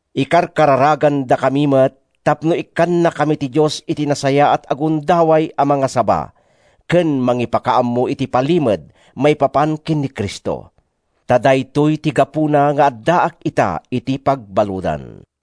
Ikarkararagandakami met tapno ikkannakami ti Dios iti nasayaat a gundaway a mangasaba ken mangipakaammo iti palimed maipapan ken ni Cristo. Ta daytoy ti gapuna nga addaak ita iti pagbaludan.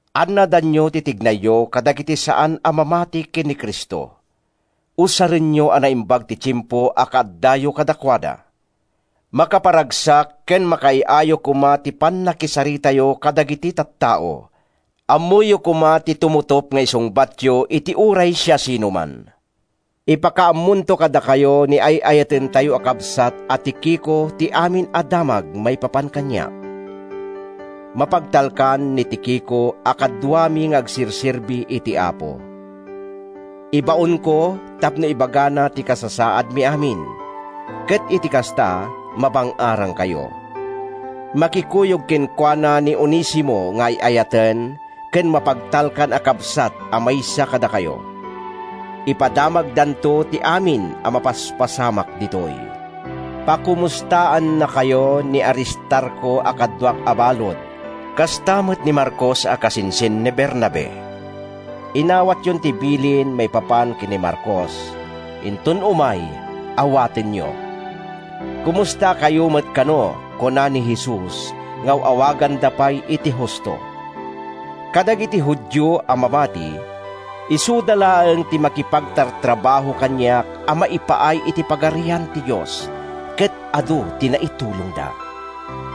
Annadanyo ti tignayyo kadagiti saan a mamati ken ni Cristo. Usarenyo a naimbag ti tiempo a kaaddayo kadakuada. Makaparagsak ken makaay-ayo koma ti pannakisaritayo kadagiti tattao, ammoyo koma ti tumutop nga isungbatyo iti uray siasinoman. Ipakaammonto kadakayo ni ay-ayatentayo a kabsat a Tikico ti amin a damag maipapan kaniak. Mapagtalkan ni Tikico a kaduami nga agserserbi iti Apo. Ibaonko tapno ibagana ti kasasaadmi amin, ket iti kasta, mabang-arankayo. Makikuyog kenkuana ni Onesimo nga ay-ayaten ken mapagtalkan a kabsat a maysa kadakayo. Ipadamagdanto ti amin a mapaspasamak ditoy. Pakomustaannakayo ni Aristarco a kaduak a balud, kasta met ni Marcos a kasinsin ni Bernabe. (Inawatyon ti bilin maipapan ken ni Marcos. Inton umay, awatenyo.) Komustakayo met kano, kuna ni Jesus nga aw-awaganda pay iti Justo. Kadagiti Judio a mamati, isuda laeng ti makipagtartrabaho kaniak a maipaay iti Pagarian ti Dios, ket adu ti naitulongda.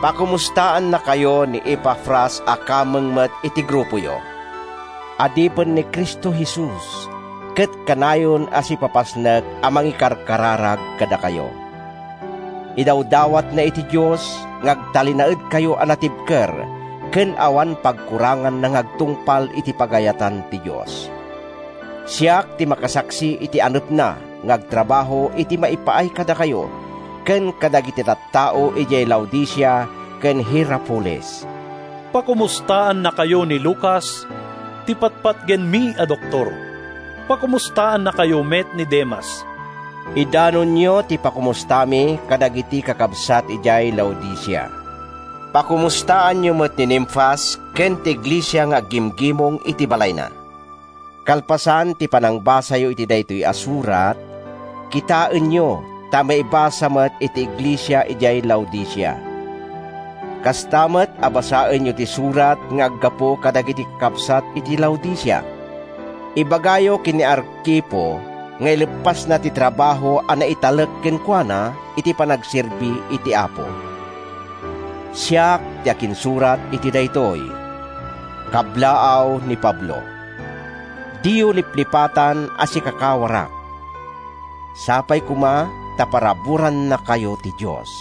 Pakomustaannakayo ni Epafras a kameng met iti grupoyo. Adipen ni Cristo Jesus ket kanayon a sipapasnek a mangikarkararag kadakayo. Idawdawatna iti Dios nga agtalinaedkayo a natibker ken awan pagkuranganna nga agtungpal iti pagayatan ti Dios. Siak ti makasaksi iti anepna nga agtrabaho iti maipaay kadakayo ken kadagiti tattao idiay Laodicea ken Hierapolis. Pakomustaannakayo ni Lucas, ti patpatgenmi a doktor. Pakomustaannakayo met ni Demas. Idanonyo ti pakomustami kadagiti kakabsat idiay Laodicea. Pakomustaanyo met ni Nimfas ken ti iglesia nga aggimgimong iti balayna. Kalpasan ti panangbasayo iti daytoy a surat, kitaenyo ta maibasa met iti iglesia idiay Laodicea. Kasta met a basaenyo ti surat nga aggapu kadagiti kakabsat iti Laodicea. Ibagayo ken ni Arkipo nga ileppasna ti trabaho a naitalek kenkuana iti panagserbi iti Apo. Siak ti akinsurat iti daytoy: Kablaaw ni Pablo. Diyo liplipatan a sikakawarak! Sapay koma ta paraburannakayo ti Dios.